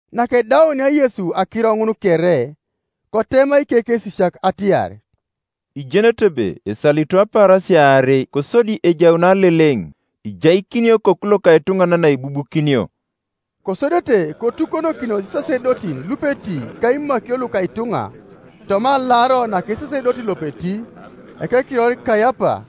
Nakedaunia Yesu akiro ŋun kere, kotema ikekesisiak atiar, “Ijenete ebe esalito apaarasia aarei, kosodi ejaun Aleleŋ, ijaikinio Okoku loka etuŋanan aibubukinio.” Kosodete kotukonokinos isasedotin lupeti ka imakio luka ituŋa toma alaro naka esasedoti lopeti, ekekiror Kaiapa,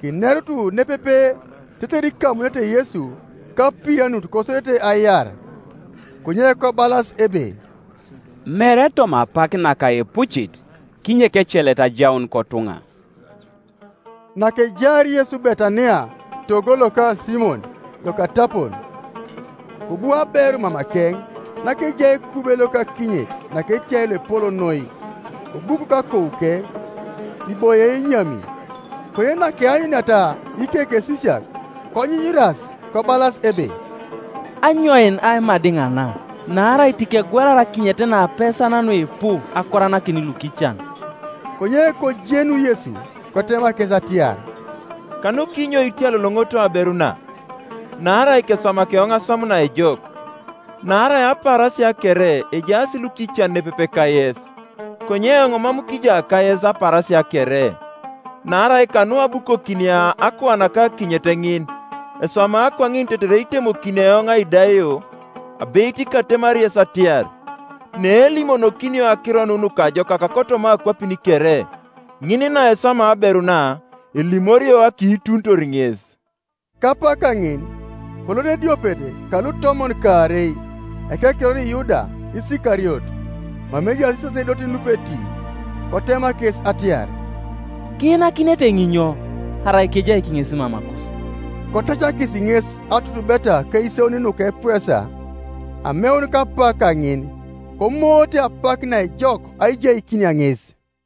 kinerut nepepe tetere ikamunete Yesu kapirianut kosodete aiar. Konye kobalas ebe, “Mere toma apak naka epucit, kinyek ecelet ajaun kotuŋa.” Nakejaar Yesu Betania togo loka Simon lokatapon, kobu aberu mamakeŋ nakejai ekube loka akinyet naketiai loepol noi, kobukok akouke, iboie enyami, Konye nakeanyuniata ikekesisiak, konyunyuras kobalas ebe, “Anyoin aimadiŋ na? Naarai tikegwelar akinyet na apesan nuipu, akoranakin lukican.” Konye kojenu Yesu, kotema kes atiar, “Kanukinyo itiyaloŋoŋooto aberu na? Naarai keswamaki eoŋ aswam naejok. Naarai apaarasia kere ejaas lukican nepepe kayes, konye eoŋ mam kija kayes apaarasia kere. Naarai kanu abukokinia akuanaka akinyet ŋin, eswama kwaŋin tetere itemokini eoŋ aidaio. Abeit katemari yes atiar, Neelimonokinio Akiro nu Nukajokak kotoma akwapin kere, ŋin naeswama aberu na elimorio akiitunitor ŋes.” Kapak kaŋin kolot ediopet kalutomon kaarei, ekekiror Yuda Isikariot, mama ejaas isasedotin lupeti, kotema kes atiar, “Kiinakinete eoŋ inyo arai kejaik ŋes mamakus?” Kotacakis ŋes atutubeta akaisauni nuka epuesa. Ameun kapak kaŋin komoote apak naejok aijaikinia ŋes.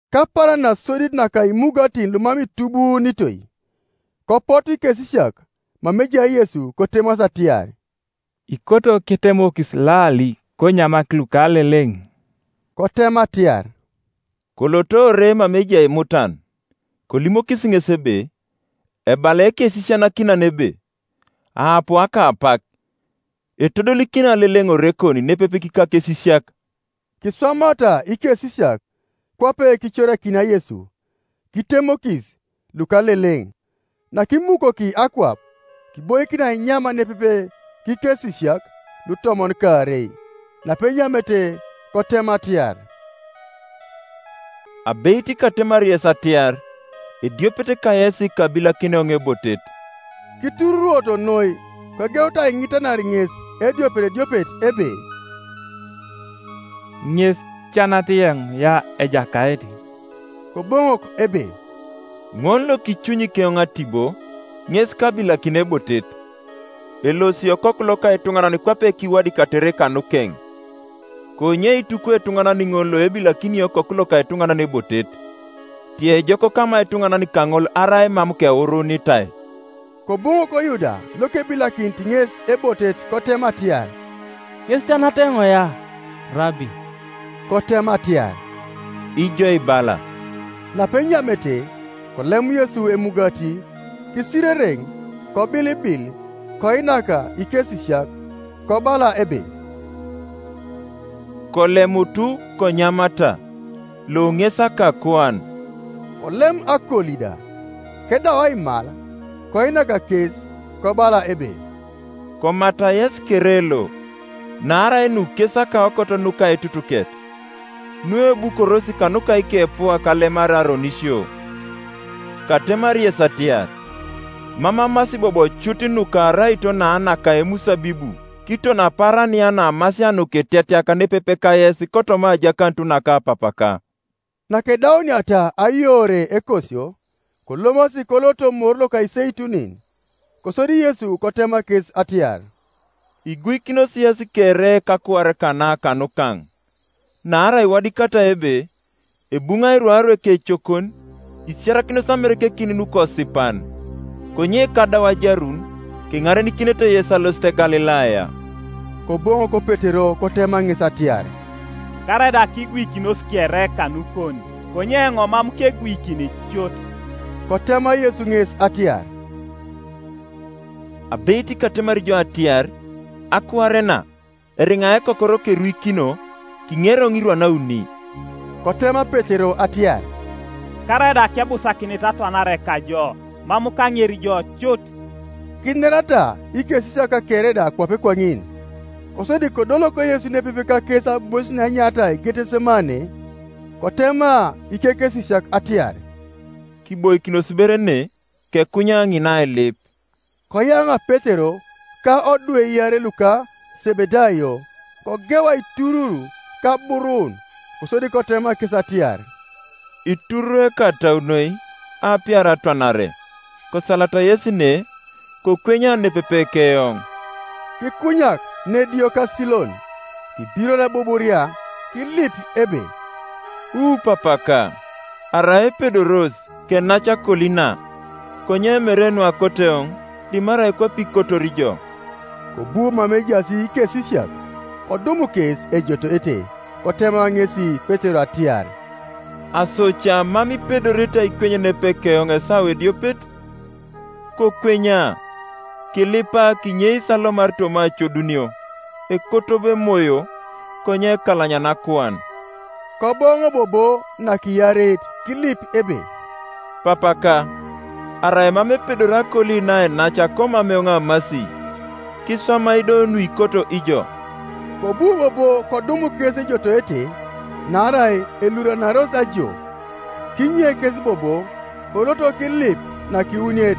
Kapaaran nasodit naka imugatin lumam itubuunitoi, kopotu ikesisiak mama ejai Yesu, kotemasi atiar, “Ikoto ketemokis lali konyamak lukaleleŋ?” Kotema atiar, “Kolot ore mama ejai mutan, kolimokis ŋes ebe, ‘Ebala Ekesisianakinan ebe, aapu akapak; etodolikini Aleleŋ orekon nepepe kikakesisiak.’” Kiswamata ikesisiak kwape kicorakinia Yesu, kitemokis lukaleleŋ. Nakimukoki akwap, kiboikin ainyam nepepe kikesisiak lutomon kaarei; napenyamete, kotema atiar, “Abeit katemari yes atiar, ediopet kayes kabilakini eoŋ ebotet.” Kitururwoto noi, kogeut aiŋitanar ŋes ediopet ediopet ebe, “Ŋes ca nat eoŋ ya, Ejakait?” Koboŋok ebe, “Ŋol lokicunyi keoŋ atibo, ŋes kabilakini ebotet. Elosi Okoku loka etuŋanan kwape kiwadikatere kanukeŋ, konye itukwi etuŋanan ŋol loebilakini Okoku loka etuŋanan ebotet! Tiejok kama ketuŋanan kaŋol arai mam kewuruunitai.” Koboŋok Yuda lokebilakinit ŋes ebotet kotema atiar, “Ŋes ca nat eoŋ ya, Rabi?” Kotema atiar, “Ijo ibala.” Napenyamete, kolem Yesu emugati, kisirereŋ, kobilibil, koinak ikesisiak, kobala ebe, “Kolemutu, konyamata; lo ŋes akakuan.” Kolem akoli da, kedau aimal, koinak kes, kobala ebe, “Komata yesi kere lo: naarai nu kes akaokot nuka aitutuket, nuebukoros kanuka ikepuak alemar aronisio, Katemari yes atiar, Mam amasi bobo cut nuka araito na naka emusabibu kiton apaaran ya naamasia nukitetiak nepepe kayes kotoma ajakanut naka Papaka.” Nakedauniata ayoore ekosio, kolomasi koloto Moru loka Iseitunin. Kosodi Yesu kotema kes atiar, “Iguikinos yesi kere kakuar kana kanukaŋ; naarai iwadikatai ebe, ‘Ebuŋai rwaru ekecokon, isiarakinos amerekekin nukosipan.’ Konye kadau ajarun, keŋarenikinete yes alosit Galilaya.” Koboŋok Petero kotema ŋes atiar, “Karaida kiguikinos kere kanukon, konye eoŋ mam keguikini cut.” Kotema Yesu ŋes atiar, “Abeit katemari jo atiar, akuar na, eriŋa ekokoro keruikino, kiŋeri eoŋ irwan auni.” Kotema Petero atiar, “Karaida kebusakinit atwanare kajo, mam kaŋeri jo cut.” Kinerata ikesisiak kere da kwape kwaŋin. Kosodi kodolok Yesu nepepe kakes aibois naenyaritai Getesemane, kotema ikekesisiak atiar, “Kiboikinos ber ne, kekunya ŋina ailip.” Koyaŋa Petero ka odwe iarei luka Sebedayo, kogeu aiturur ka aburun. Kosodi kotema kes atiar, “Itururwei ekatau noi, aapiar atwanare; kosalata yesi ne, kokwenya nepepe keoŋ.” Kikunyak nediokasilon, kibiror ebuburia, kilip ebe, “Wu Papaka, arai epedoros, kenac akoli na; konye mere nuakoto eoŋ, dimarai kwape ikotor ijo.” Kobu mama ejaas ikesisiak, kodum kes ejotoete; kotema ŋesi Petero atiar, “Aso ca mam ipedorete aikweny nepepe keoŋ esawa ediopet? Kokwenya, kilipa kinyeis alomar toma acodunio; ekoto bo emoyo, konye ekalanyana akuan.” Koboŋo bobo nakiareit kilip ebe, “Papaka, arai mam epedori akoli na ainac komam eoŋ amasi, kiswamai do nuikoto ijo.” Kobu bobo kodum kes ejotoete, naarai eluranaros ajo. Kinye kes bobo, kolot kilip nakiwuniet,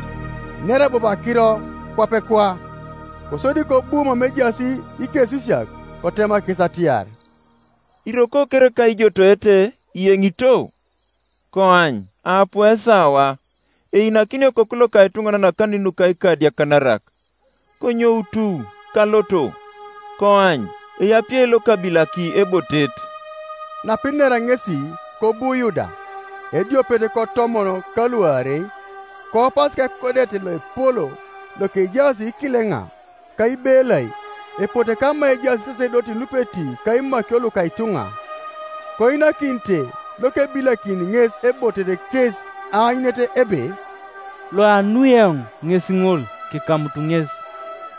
inera bobo akiro kwapekwa. Kosodi kobu mama ejaas ikesisiak, kotema kes atiar, “Iroko kereka ijotoete, iyeŋito? Koany aapu esawa, einakinio Okoku loka etuŋanan akanin nuka ikadiakanarak. Konyoutu, kaloto; koany, eapie lokabilaki ebotet.” Napinera ŋesi kobu Yuda, ediopet kotomon kaluarei, koupas kekodet loepol lokejaas ikileŋa, ka ibelai, epote kama ejaas isasedotin lupeti ka imakio luka ituŋa, Koinakinite lokebilakini ŋes ebotet kes aanyunet ebe, “Loanui eoŋ ŋes ŋol; kikamutu ŋes.”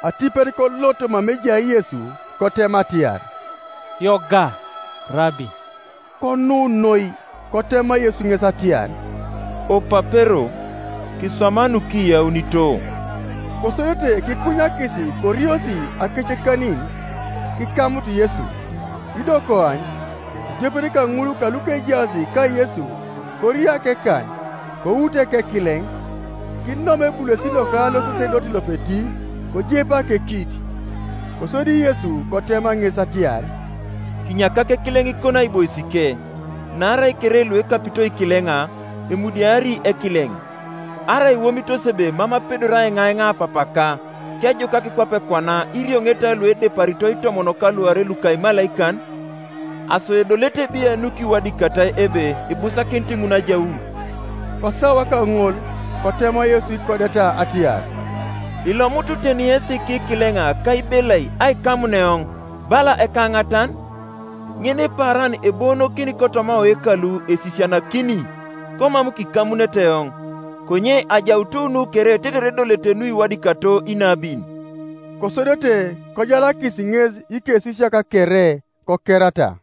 Atipet kolot mama ejai Yesu, kotema atiar, “Yoga, Rabi!” Konu noi, Kotema Yesu ŋes atiar, “Opapero, kiswama nukiyaunito.” Kosodete kikunyakis koriosi akecekanin kikamut Yesu, Ido koany, ediopet kaŋul kalukejaas kaYesu korio akekan, kout ekekileŋ, kinom ebulesit loka losasedoti lopeti, kojepa akekit. Kosodi Yesu kotema ŋes atiar, “Kinyakak ekileŋikon aiboisike; naarai kere luekapito ikileŋa, emudiari ekileŋ. Arai iwomitos ebe mam apedori aiŋaiŋa Papaka, kejukak kwape kwana irioŋeta luedeparito itomon ka luarei luka imalaikan? Aso edolete biai nukiwadikatai ebe ibusakinit ŋun ajaun?” Kosawa kaŋol kotema Yesu ikodeta atiar, “Ilomutu teni yesi kikileŋa ka ibelai aikamun eoŋ, bala ekaŋatan? Ŋinipaaran eboonokin kotoma oyekalu esisianakini, komam kikamunete eoŋ. Konye ajaut nu kere tetere edolete nukiwadikato inabin.” Kosodete kojalakis ŋes ikesisiak kere, kokerata.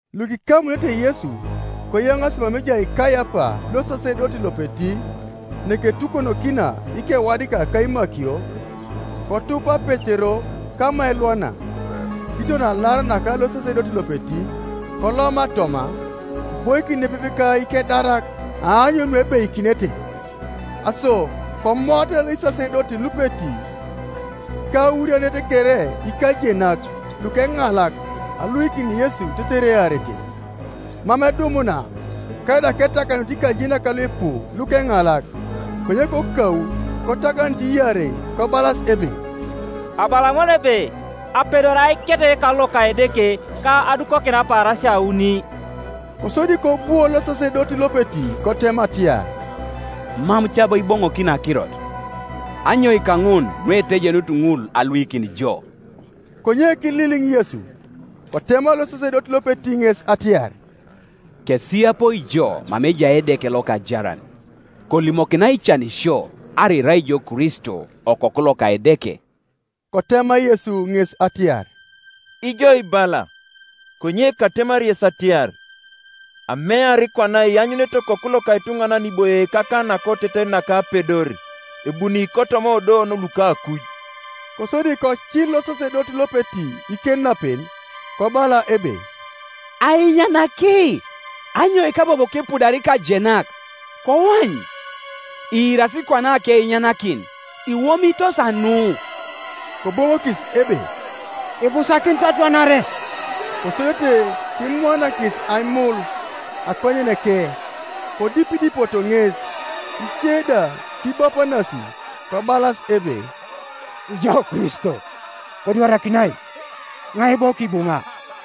Lukikamunete Yesu koyaŋaasi mama ejai Kaiapa losasedoti lopeti, neketukonokina ikewadikak ka imakio. Kotupa Petero kama elwana, kiton alaro naka losasedoti lopeti, koloma toma, kiboikin nepepe ka ikedarak aanyun nuebeikinete. Aso komoata isasedotin lupeti ka aurianet kere ikajenak lukeŋalak aluikin Yesu tetere earete, mam edumuna, karaida ketakanut ikajenak luipu lukeŋalak, Konye kokau kotakanut iarei, kobalas ebe, “Abala ŋol ebe, apedori aiket eyekalu loka Edeke, ka adukokin apaarasia auni.” Kosodi kobwo losasedoti lopeti kotema atiar, “Mam ca bo iboŋokini akirot? Anyoika ŋun nuetejenut ŋul aluikin jo?” Konye kililiŋ Yesu. Kotema losasedoti lopeti ŋes atiar, “Kesiyapoi jo mama ejai Edeke lokajaran, kolimokinai cani sio arai irai ijo Kristo, Okoku loka Edeke.” Kotema Yesu ŋes atiar, “Ijo ibala, Konye katemari yes atiar, Amear kwana ianyunete Okoku loka etuŋanan iboie kakan nakoteten naka Apedor, ebuni kotoma odouon luka akuj.” Kosodi kocil losasedoti lopeti ikenapen, kobala ebe, “Ainyanaki, Anyoika bobo kipudar ikajenak? Koany, iirasi kwana akeinyanakin. Iwomitos anu?” Koboŋokis ebe, “Ibusakinit atwanare.” Kosodete kimwaanakis aimul akonyeneke, kodipidipoto ŋes; ice da kibapanasi, kobalas ebe, “Ijo Kristo, kodwarak iŋai! Iŋai bo kibuŋa?”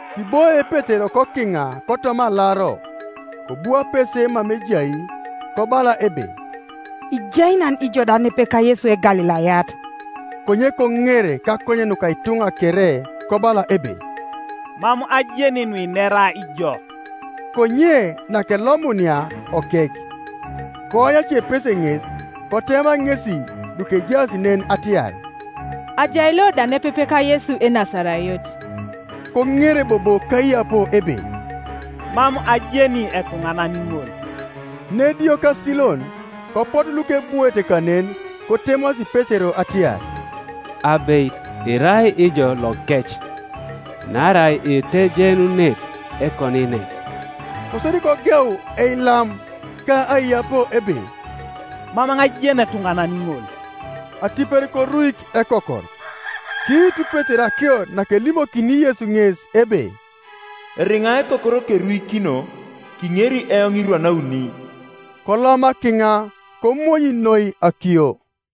Kiboie Petero kokiŋa kotoma alaro: kobu apese mama ejai kobala ebe, “Ijai nan ijo da nepepe kaYesu Egalilayat.” Konye koŋer kakonyen nuka ituŋa kere, kobala ebe, “Mam ajeni nuinera ijo.” Konye nakelomunia okek, koany acepese ŋes, kotema ŋesi lukejaas nen atiar, “Ajai lo da nepepe ka Yesu Enasarayot.” Koŋer bobo kaiyapo ebe, “Mam ajeni etuŋanan ŋol.” Nediokasilon kopotu lukebwoete kanen, kotemasi Petero atiar, “Abeit irai ijo lokec, naarai itejenunit ekoniiner.” Kosodi kogeu eilam ka aiyapo ebe, “Mam eoŋ ajeni etuŋanan ŋol.” Atipet koruik ekokor. Kiitu Petero akirot nakelimokini Yesu ŋes ebe, “Eriŋa ekokor keruikino, kiŋeri eoŋ irwan auni.” Koloma kiŋa komonyi noi akiyo.